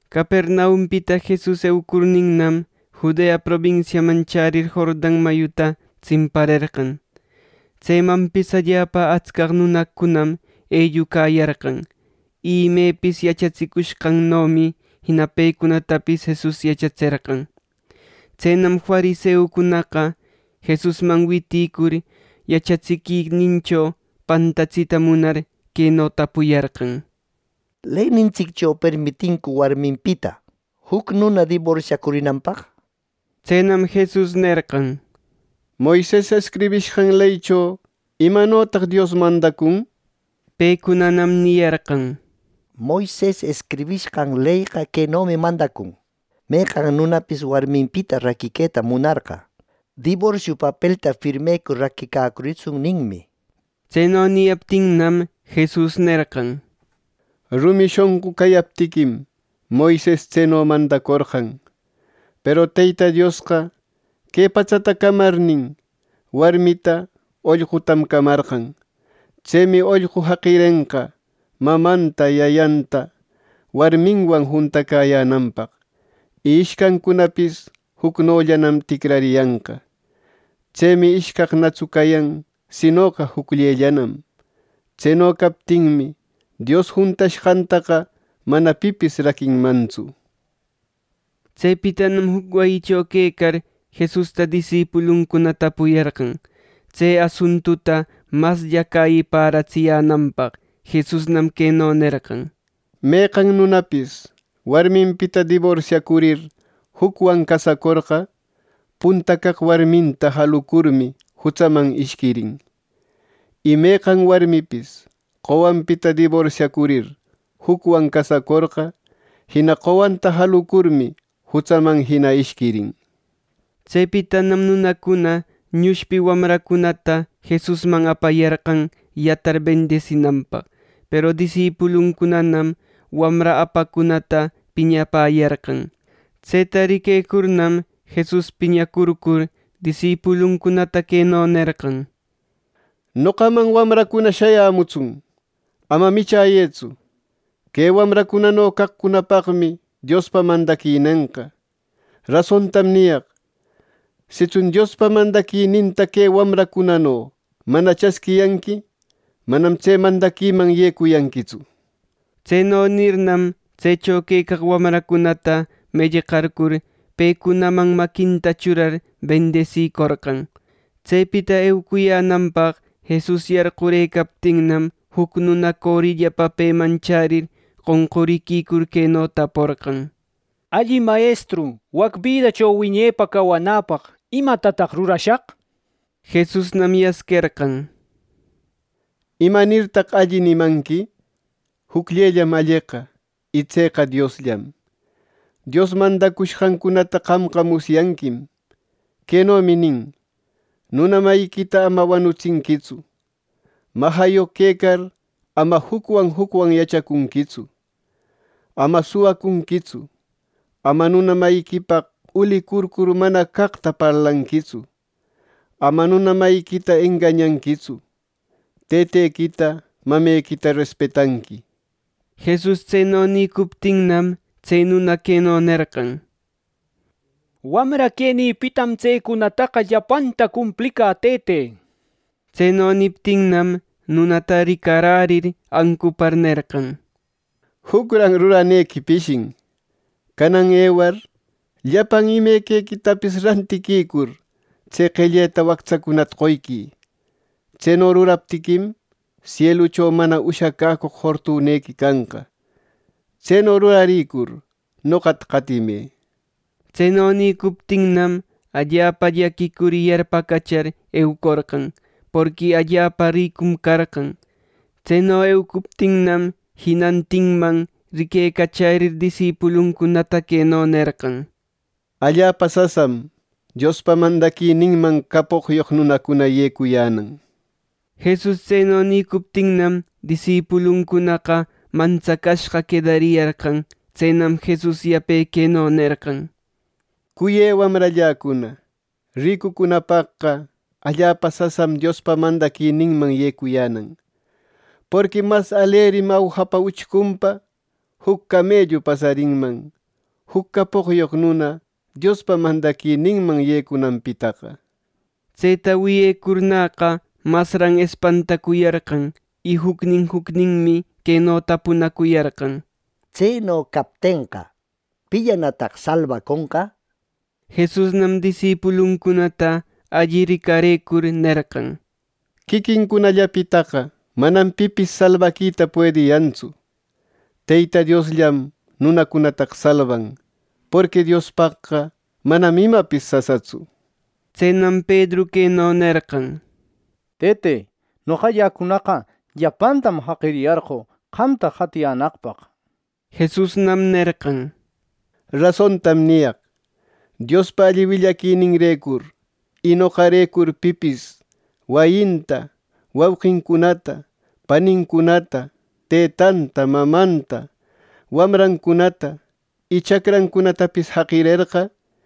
Capernaumpita Jesus eucurninnam, Judea probinsiaman chärir Jordan mayuta tsimparerqan. Tsemanpis allapa atsca nunacunam ellucayarqan, y imepis yachatsicushqannomi jina pecunatapis Jesus yachatserqan. Tsenam fariseucunaqa, Jesusman witïcur yachatsiquinincho pantatsita munar, queno tapuyarqan: —¿Leynintsiccho permitincu warminpita juc nuna diborsiacurinanpaq? —nir. Tsenam Jesus nerqan: —Moises escribishqan leycho ¿imanotaq Dios mandacun? Pecunanam niyarqan: —Moises escribishqan leyqa quenomi mandacun: ‘Meqan nunapis warminpita raquiqueta munarqa, diborsio papelta firmecur raquicacuritsun’, ninmi —nir. Tseno niyaptinnam, Jesus nerqan: —Rumi shonqu cayaptiquim, Moises tseno mandacorqan. Peru Teyta Diosqa, Que patsata camarnin, warmita ollqutam camarqan. Tsemi, ollqu jaqirenqa mamanta yayanta warminwan juntacäyänanpaq, Y ishcancunapis jucnollanam ticrariyanqa. Tsemi ishcaqnatsu cayan, sinoqa jucllellanam. Tseno captinmi, Dios juntashqantaqa mana pipis raquinmantsu. Tsepitanam juc wayicho quecar, Jesusta disipuluncuna tapuyarqan tse asuntuta maslla cäyiparatsiyänanpaq. Jesusnam queno nerqan: —Meqan nunapis warminpita diborsiacurir jucwan casacorqa, punta caq warminta jalucurmi jutsaman ishquirin; y meqan warmipis qowanpita diborsiacurir jucwan casacorqa, jina qowanta jalucurmi jutsaman jina ishquirin. Tsepitanam nunacuna ñushpi wamrancunata Jesusman apayarqan yatar bendisinanpaq; peru disipuluncunanam wamra apaqcunata piñapäyarqan. Tseta riquecurnam, Jesus piñacurcur disipuluncunata queno nerqan: —¡Noqaman wamracuna shayämutsun! ¡Ama michäyëtsu! Que wamracunano caqcunapaqmi Diospa mandaquinenqa. Rasontam niyaq: Sitsun Diospa mandaquininta que wamracunano mana chasquiyanqui, manam tse mandaquiman yecuyanquitsu. Tseno nirnam, tsecho quecaq wamracunata mellqarcur, pecunaman maquinta churar bendisicorqan. Tsepita eucuyänanpaq Jesus yarqurëcaptinnam, juc nuna corillapa peman chärir qonquricur queno taporqan: —Alli mayestru, wac bidacho wiñepa cawanäpaq ¿imatataq rurashaq? Jesusnam yasquerqan: —¿Imanirtaq ‘Alli’ nimanqui? Jucllellam alleqa, y tseqa Diosllam. Dios mandacushqancunata qamqa musyanquim. Quenomi nin: ‘Nuna mayiquita ama wanutsinquitsu. Majayoq quecar, ama jucwan jucwanqa yachacunquitsu. Ama suwacunquitsu. Ama nuna mayiquipaq ulicurcur mana caqta parlanquitsu. Ama nuna mayiquita engañanquitsu. Tëtequita, mamequita respetanqui.’ Jesus tseno nïcuptinnam, tse nuna queno nerqan: —Wamra quenïpitam tsecunataqa llapanta cumplicä, tëte. Tseno niptinnam, nunata ricarärir ancupar nerqan: —Jucran ruranequi pishin. Canan ewar llapan imequicunatapis rantiquicur, tse qelleta wactsacunata qoyquï. Tseno ruraptiquim, sielucho mana ushacäcoq fortunequi canqa. Tseno rurarïcur, noqata qatimë. Tseno nïcuptinnam, allapa llaquicur y yarpacachar eucorqan, porqui allapa ricum carqan. Tseno eucuptinnam, jinantinman riquecachärir disipuluncunata queno nerqan: —¡Allapa sasam Diospa mandaquininman capoqyoq nunacuna yecuyänan! Jesus tseno nïcuptinnam, disipuluncunaqa mantsacashqa quedariyarqan. Tsenam Jesus yape queno nerqan: —Cuyë wamralläcuna, ricucunapaqqa allapa sasam Diospa mandaquininman yecuyänan. ¡Porqui mas alerim awjapa uchcunpa juc camellu pasarinman, juc capoqyoq nuna Diospa mandaquininman yecunanpitaqa! Tseta wiyecurnäqa, masran espantacuyarqan. Y jucnin jucninmi queno tapunacuyarqan: —Tseno captenqa, ¿pillanataq salbaconqa! —nir. Jesusnam disipuluncunata alli ricarëcur nerqan: —Quiquincunallapitaqa manam pipis salbaquita puediyantsu, Teyta Diosllam nunacunataqa salban, porqui Diospaqqa manam imapis sasatsu. Tsenam Pedru queno nerqan: —Tëte, noqalläcunaqa llapantam jaqiriyarqö, qamta qatiyänaqpaq. Jesusnam nerqan: —Rasontam niyaq: Diospa alli willaquininrecur y noqarecur pipis wayinta, wauqincunata, panincunata, tëtanta, mamanta, wamrancunata y chacrancunatapis jaqirerqa,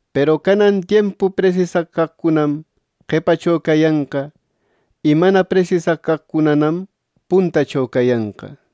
Peru canan tiempu presisaq caqcunam qepacho cayanqa, y mana presisaq caqcunanam puntacho cayanqa.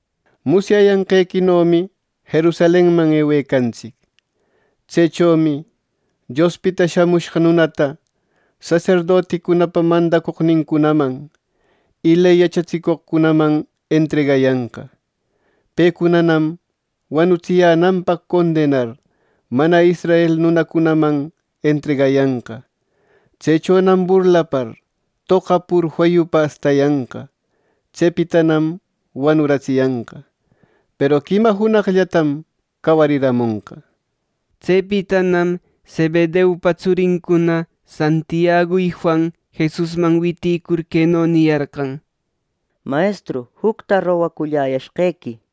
—Musyayanqequinomi Jerusalenman ewecantsic. Tsechomi Diospita Shamushqa Nunata saserdoticunapa mandacoqnincunaman y ley yachatsicoqcunaman entregayanqa. Pecunanam wanutsiyänanpaq condenar mana israel nunacunaman entregayanqa. Tsechonam burlapar, toqapur feyupa astayanqa. Tsepitanam wanutsiyanqa; peru quima junaqllatam cawarimonqa —nir. Tsepitanam Zebedeupa tsurincuna Santiagu y Juan Jesusman witïcur queno niyarqan: —Mayestru, jucta rogaculläyashqequi —nir.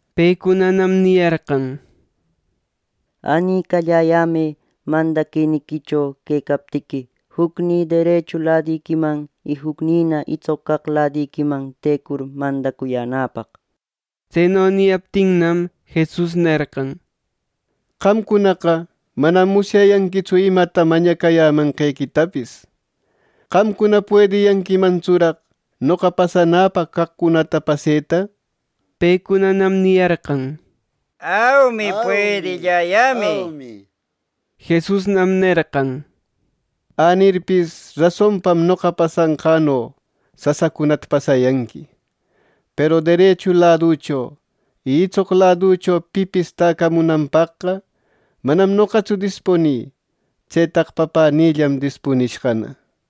Pecunanam niyarqan: —Änicalläyämë mandaquiniquicho quecaptiqui, jucnï derechu ladiquiman y jucnïna itsoq caq ladiquiman tecur mandacuyänäpaq. Tseno niyaptinnam, Jesus nerqan: —Qamcunaqa manam musyayanquitsu imata mañacayämanqequitapis. ¿Qamcuna puediyanquimantsuraq noqa pasanäpaq caqcunata paseta? Pecunanam “Aumi, puedilläyämi” niyarqan. Jesusnam nerqan: —Änirpis rasonpam noqa pasanqäno sasacunata pasayanqui; peru derechu laducho y itsoq laducho pipis täcamunanpaqqa manam noqatsu dispunï. Tsetaqa Papänïllam dispunishqana.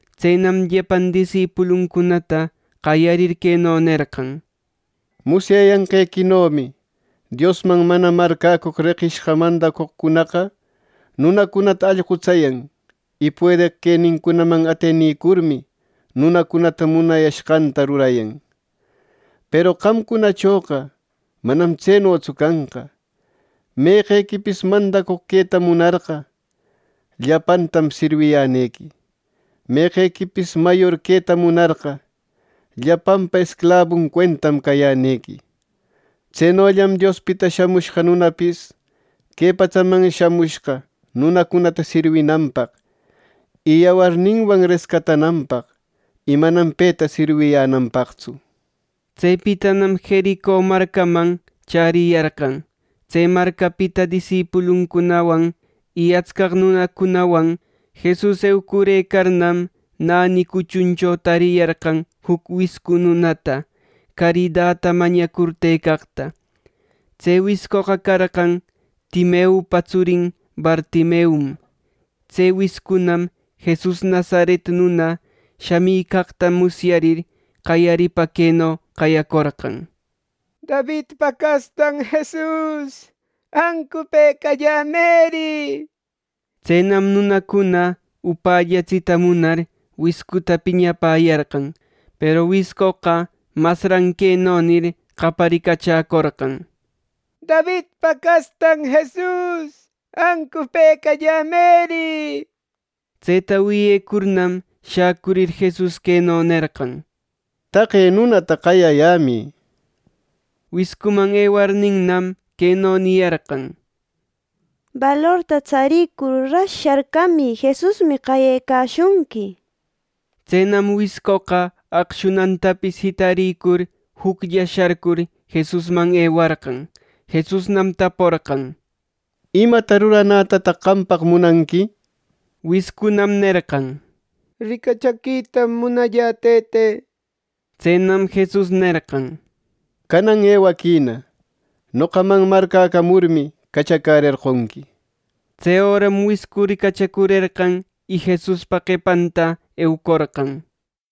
Tsenam llapan disipuluncunata qayarir queno nerqan: —Musyayanqequinomi Diosman mana marcäcoq reqishqa mandacoqcunaqa nunacunata allqutsayan, y puedeq quenincunaman atenicurmi, nunacunata munashqanta rurayan. Peru qamcunachoqa manam tsenotsu canqa. Meqequipis mandacoq queta munarqa, llapantam sirwiyänequi. Meqequipis mayor queta munarqa, llapanpa esclabun cuentam cayänequi. Tsenollam Diospita Shamushqa Nunapis que patsaman shamushqa nunacunata sirwinanpaq y yawarninwan rescatananpaq, y manam peta sirwiyänanpaqtsu. Tsepitanam Jerico marcaman chäriyarqan. Tse marcapita disipuluncunawan y atscaq nunacunawan Jesus eucurëcarnam, näni cuchuncho tariyarqan juc wiscu nunata caridata mañacur tëcaqta. Tse wiscoqa carqan Timeupa tsurin Bartimeum. Tse wiscunam Jesus Nazaret nuna shamicaqta musyarir, qayaripa queno qayacorqan: —¡Davidpa castan Jesus, ancupëcallämëri! —nir. Tsenam nunacuna upällatsita munar wiscuta piñapäyarqan, peru wiscoqa masran queno nir, qayaricachäcorqan: —¡Davidpa castan Jesus, ancupëcallämëri! —nir Tseta wiyecurnam, shäcurir Jesus queno nerqan: —Taqe nunata qayayämï —nir. Wiscuman ewarninnam, queno niyarqan: —¡Balorta tsaricur, ras sharcamï! Jesusmi qayecashunqui —nir. Tsenam wiscoqa aqshunantapis jitarïcur juclla sharcur Jesusman ewarqan. Jesusnam taporqan: —¿Imata ruranätataq qampaq munanqui? Wiscunam nerqan: —¡Ricachaquitam munallä, Tëte! —nir. Tsenam Jesus nerqan: —Canan ewaquïna. Noqaman marcäcamurmi, cachacärerqonqui. Tse öram wiscu ricachacurerqan, y Jesuspa qepanta eucorqan.